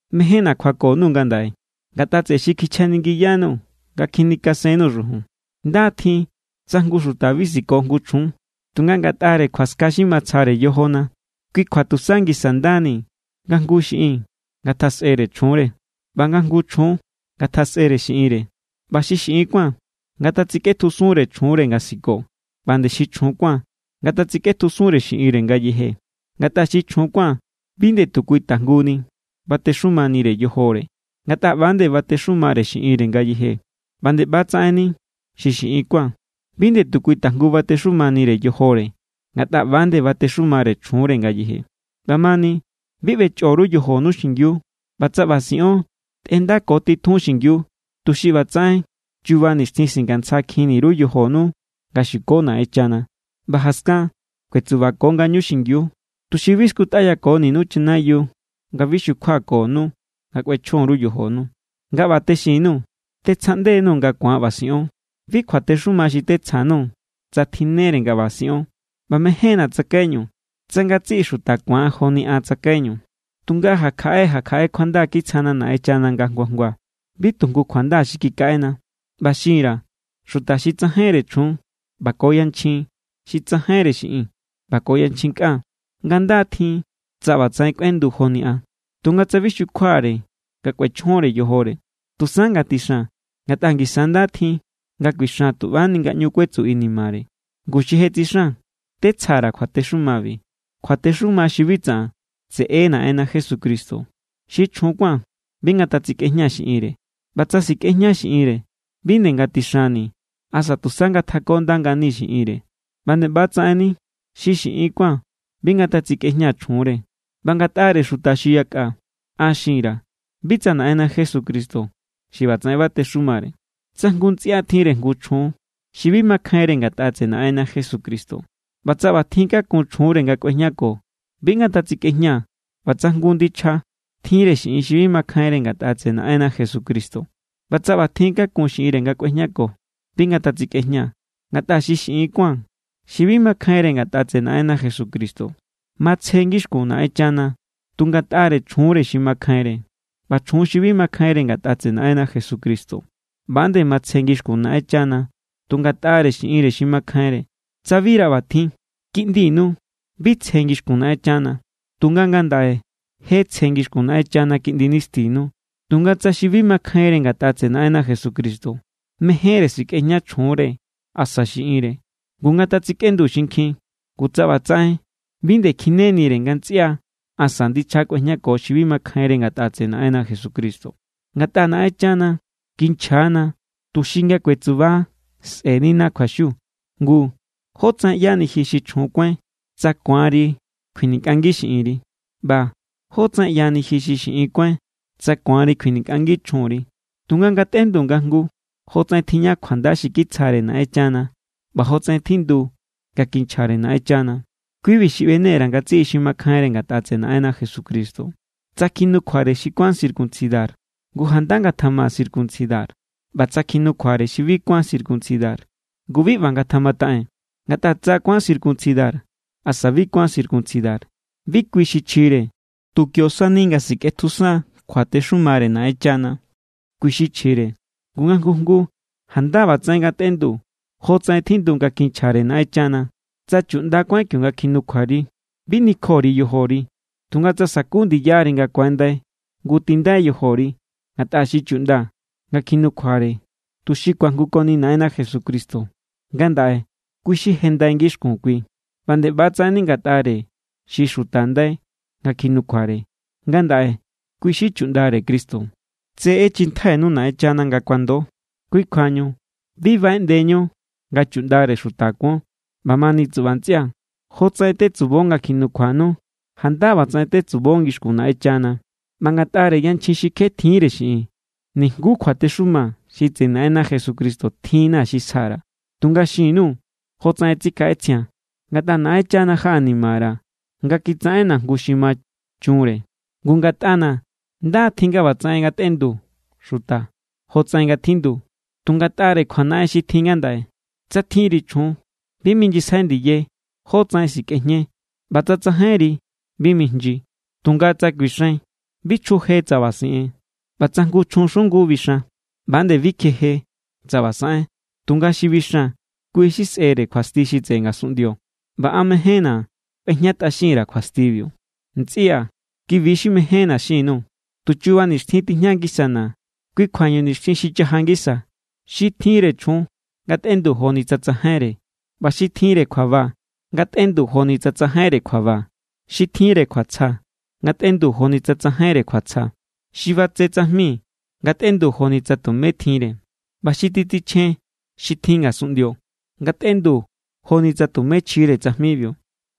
Mejénna̱ kjuako_nuu̱ ngandaꞌe ngatꞌa tseꞌe xi kichjaningiyanuu̱ nga kjinikasennuu̱ xujun. Nda= tjin tsa jngu xuta bi siko jngu chjun. Tunga ngatꞌare kjuaska xi matsjare yojona, kui kjua tusa ngisa ndani nga jngu jngu xiꞌin ngatjasꞌere chjunre, ꞌba nga jngu jngu chjun ngatjasꞌere xiꞌinre. ꞌBa xi xiꞌin kuán ngatatsikꞌetjusunre chjunre nga siko, ꞌba nde xi chjun kuán ngatatsikꞌetjusunre xiꞌinre ngayeje. Ngatꞌa xi chjun kuán bi nde kui tajnguni batexumanire yojore, ngatꞌa ꞌba=nde batexumare xiꞌinre ngayeje. ꞌBa nde ꞌba=tsaꞌenni xi xiꞌin kuán. Bi nde kui tajngu batexumanire yojore, ngatꞌa ꞌba=nde batexumare chjunre ngayeje. ꞌBamani, bi ꞌbechꞌo_ru yojonu xingiu. ꞌBa tsa ꞌba siꞌon, tꞌendako titjun xingiu, tuxi ꞌbatsaꞌen chuba nixtjin singantsjakjinni_ru yojonu nga xuko Naꞌenchana. ꞌBa jaskan kuetsuko ngañu xingiu, tuxi bi skutꞌayakoninu chanayiu, nga bi xukjuakonu nga kꞌuechjon_ru yojonu. Nga ꞌba texin_nuu̱, tetsjaꞌnde_nuu̱ nga ku̱an ꞌba siꞌon. Bi kjuatexuma xi tetsja_nuu̱ tsa tjinnere nga ꞌba siꞌon. ꞌBa mejénna̱ tsakaiñu tsa ngatsiꞌi xuta ku̱an joni an tsakaiñu, tunga ja kjaꞌe ja kjaꞌe kjuanda kitsjana Naꞌenchana nga jngua jngua. Bi tu jngu kjuanda xi kikaꞌena. ꞌBa xin_ra̱ xuta xi tsajainre chjun ꞌba ko yanchjin xi tsajainre xiꞌin ꞌba ko yanchjin kꞌan, nga nda= tjin tsa ꞌbatsaꞌen kꞌuendu joni an. Tunga tsa bi xukjuare nga kꞌuechjonre yojore, tusa ngatixan. Ngatꞌa ngisa= nda tjin nga kuixan tu ꞌbani nga ꞌñu kuetsu inimare. Ngu, xi je tsixan tetsja_ra̱ kjuatexumabi, kjuatexuma xi bi tsaꞌan, tseꞌe= Naꞌenna Jesucristo. Xi chjun kuán bi ngatsikꞌejña xiꞌinre. ꞌBa tsa sikꞌejña xiꞌinre, bi nde ngatixanni asa tusa ngatjakonda ngani xiꞌinre. ꞌBa nde ꞌbatsaꞌenni xi xiꞌin kuán bi ngatsikꞌejña chjunre. ꞌBa ngatꞌare xuta xi yakꞌa, an xin_ra̱, bi tsa Naꞌenna Jesucristo xi ꞌbatsaꞌen batexumare. Tsa jngu ntsꞌia tjinre jngu chjun xi bi makjainre ngatꞌa tseꞌe Naꞌenna Jesucristo, ꞌba tsa ꞌbatjin kakun chjunre nga kꞌuejñako, bi ngatatsikꞌejña. ꞌBa tsa jngu ndichja tjinre xiꞌin xi bi makjainre ngatꞌa tseꞌe Naꞌenna Jesucristo ꞌba tsa ꞌbatjin kakun xiꞌinre nga kꞌuejñako, bi ngatatsikꞌejña. Ngatꞌa xi xiꞌin kuán xi bi makjainre ngatꞌa tseꞌe Naꞌenna Jesucristo, matsje ngixkun Naꞌenchana tu ngatꞌare chjunre xi makjainre. ꞌBa chjun xi bi makjainre ngatꞌa tseꞌe Naꞌenna Jesucristo, ꞌba=nde matsje ngixkun Naꞌenchana tu ngatꞌare xiꞌinre xi makjainre. Tsa bira ꞌbatjin, kiꞌndinu bi tsje ngixkun Naꞌenchana. Tunga ngandaꞌe je tsje ngixkun Naꞌenchana kiꞌndi nistinu. Tunga tsa xi bi makjainre ngatꞌa tseꞌe Naꞌenna Jesucristo mejénre sikꞌejña chjunre asa xiꞌinre, ngu, ngatsikꞌendu xinkjin. Ngu tsa ꞌbatsaꞌen, bi nde kjinenire nga ntsꞌia asa ndichja kꞌuejñako xi bi makjainre ngatꞌa tseꞌe Naꞌenna Jesucristo. Ngatꞌa Naꞌenchana kinchja=na tuxi nga kuetsuba sꞌe̱nina kjuaxiu. Ngu, ¿jótsaꞌen ꞌyani ji xi chjun kuáin tsa ku̱anri kjuinikꞌangi xiꞌinri? ꞌBa, ¿jótsaꞌen ꞌyani ji xi xiꞌin kuáin tsa ku̱anri kjuinikꞌangi chjunri? Tunga ngatꞌendu nga jngu jnguu jotsaꞌen tijña kjuanda xi kitsjare Naꞌenchana ꞌba jotsaꞌen tjindu nga kinchjare Naꞌenchana. Kui=bi xi ꞌbene_ra̱ ngatsiꞌi xi makjainre ngatꞌa tseꞌe Naꞌenna Jesucristo. Tsa kjinukjuare xi kuán circuncidar, ngu janda ngatjama circuncidar. ꞌBa tsa kjinukjuare xi bi kuán circuncidar, ngu, bi ꞌba ngatjamataꞌen. Ngatꞌa tsa kuán circuncidar asa bi kuán circuncidar, bi kui xi chjire. Tu kio sani nga sikꞌetjusan kjuatexumare Naꞌenchana, kui= xi chjire. Ngu, nga jngu jnguu janda ꞌbatsaꞌen ngatꞌendu jotsaꞌen tjindu nga kinchjare Naꞌenchana. Tsa chuꞌnda kuáin kionga nga kjinukjuari, bi nikjo_ri yojori. Tunga tsa saku ndiyari nga ku̱andai, ngu tindai yojori. Ngatꞌa xi chuꞌnda nga kjinukjuare tuxi ku̱ajngukoni Naꞌenna Jesucristo, ngandaꞌe kui= xi je ndai ngixkun kui. ꞌBa nde ꞌbatsaꞌenni ngatꞌare xi xuta ndai nga kjinukjuare, ngandaꞌe nde kui= xi chuꞌndare Cristo. Tse ꞌechjintjainu Naꞌenchana nga kuando, kui kjuañu bi baꞌeꞌndeñu nga chuꞌndare xuta kuon. ꞌBamani tsuꞌba ntsꞌia̱, jotsaꞌen tetsubo nga kjinukjuanu, janda ꞌbatsaꞌen tetseubo ngixkun Naꞌenchana. ꞌBa ngatꞌare yanchjin xi kje tjiínre xiꞌin, nijnguú kjuatexuma xi tseꞌe Naꞌenna Jesucristo tjinna̱ xi sja_ra̱. Tunga xin_nuu̱ jotsaꞌen tsikjaꞌetsjia̱n. Ngatꞌa Naꞌenchana jaꞌanimara̱ nga kitsaꞌenna̱ jngu xi ma chunre. Ngu ngatꞌana̱ nda= tjin nga ꞌbatsaꞌen ngatꞌendu xuta jotsaꞌen nga tjindu, tu ngatꞌare kjuanaꞌen xi tjin ngandaꞌe. Tsa tjinri chjun, bi mijnyisjai ndiye jotsaꞌen sikꞌejñe. ꞌBa tsa tsajainri, bi mijnyi. Tunga tsa kuixain, bi chjuje tsa ꞌba siꞌen. ꞌBa tsa jngu chjun xungu bixan, ꞌba nde bi kjeje tsa ꞌba saꞌen. Tunga xi bixan, kui= xi sꞌe̱re kjuasti xi tseꞌe ngasunꞌndio, ꞌba an mejénna̱ kꞌuejñatꞌaxin_ra̱ kjuastibiu. Ntsꞌia̱, ki=bi xi mejénna̱ xin_nuu̱: Tu chuba nixtjin tijña ngisana. Kui kjuañu nixtjin xi chaja ngisa, xi tjinre chjun ngatꞌendu joni tsa tsajainre. ꞌBa xi tjinre kjuaba ngatꞌendu joni tsa tsajainre kjuaba, xi tjinre kjuatsja ngatꞌendu joni tsa tsajainre kjuatsja, xi batse tsajmi ngatꞌendu joni tsa tumé tjinre, ꞌba xi titsichjen xi tjin ngasunꞌndio ngatꞌendu joni tsa tumé chjire tsajmibiu.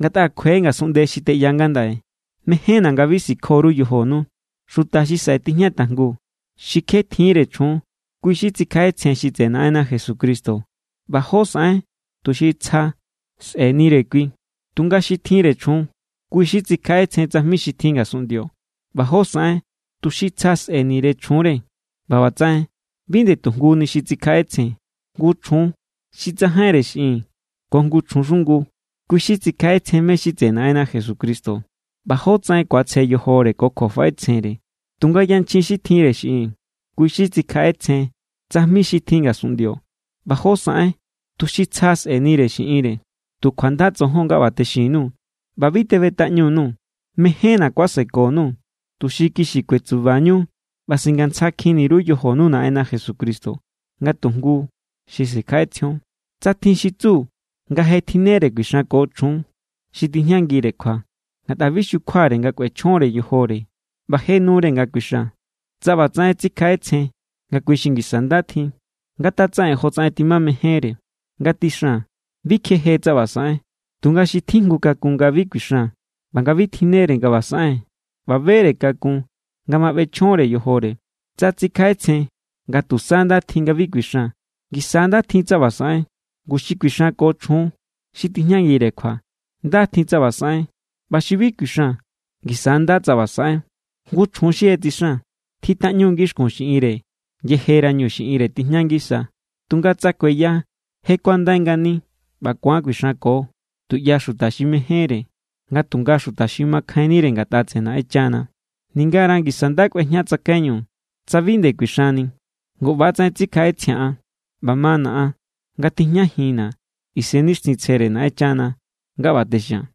Ngatꞌa kjue ngasunꞌnde xi teꞌya ngandaꞌe. Mejénna̱ nga bi sikjo_ru yojonu. Xuta xi saꞌe tijña tajngu, xi kje tjiínre chjun, kui xi tsikjaꞌetsjen xi tseꞌe Naꞌenna Jesucristo ꞌba jó saꞌen tuxi tsja sꞌe̱nire kui. Tunga xi tjinre chjun, kui xi tsikjaꞌetsjen tsajmi xi tjin ngasunꞌndio ꞌba jó saꞌen tuxi tsja sꞌe̱nire chjunre, ꞌba ꞌbatsaꞌen bi nde tu jnguni xi tsikjaꞌetsjen. Jngu chjun xi tsajainre xiꞌin ko jngu chjun xungu, kui xi tsikjaꞌetsjen mé= xi tseꞌe Naꞌenna Jesucristo ꞌba jótsaꞌen ku̱atsje yojore ko kjuafaꞌetsjenre. Tunga yanchjin xi tjinre xiꞌin, kui xi tsikjaꞌetsjen tsajmi xi tjin ngasunꞌndio ꞌba jó saꞌen tuxi tsja sꞌe̱nire xiꞌinre. Tu kjuanda tsojon nga ꞌba texin_nuu̱ ꞌba bi teꞌbetꞌaꞌñu_nuu̱. Mejénna̱ kuaseko_nuu̱, tuxi kixi kuetsubañu ꞌba singantsjakjin_ru yojonu Naꞌenna Jesucristo nga tu jngu xi sikjaꞌetsjion. Tsa tjin xi tsu nga je tjinnere kuixanko chjun xi tijñangire kjua ngatꞌa bi xukjuare nga kꞌuechjonre yojore ꞌba je nure nga kuixan, tsa ꞌbatsaꞌen tsikjaꞌetsjen nga kui xi ngisa nda tjin, ngatatsaꞌen jotsaꞌen timamejénre. Ngatixan. Bi kjeje tsa ꞌba saꞌen. Tunga xi tjijngu kakun nga bi kuixan ꞌba nga bi tjinnere nga ꞌba saꞌen ꞌba bere kakun nga ma ꞌbechjonre yojore, tsa tsikjaꞌetsjen nga tusa nda tjin nga bi kuixan, ngisa= nda tjin tsa ꞌba saꞌen. Ngu, xi kuixanko ko chjun xi tijñangire kjua, nda= tjin tsa ꞌba saꞌen. ꞌBa xi bi kuixan, ngisa= nda tsa ꞌba saꞌen. Jngu chjun xi je tsixan, tjitꞌaꞌñu ngixkun xiꞌinre yejerañu xiꞌinre tijña ngisa. Tunga tsa kueya, je kuandai ngani ꞌba ku̱an kuixanko tuꞌya xuta xi mejénre, nga tunga xuta xi makjainnire ngatꞌa tseꞌe Naꞌenchana. Ningara ngisa nda kꞌuejña tsakaiñu tsa bi nde kuixanni. Ngu ꞌbatsaꞌen tsikjaꞌetsjia̱n an, ꞌba mana̱ an nga tijñajinna̱ Isennixtjintsjere Naꞌenchana nga ꞌba texia̱n.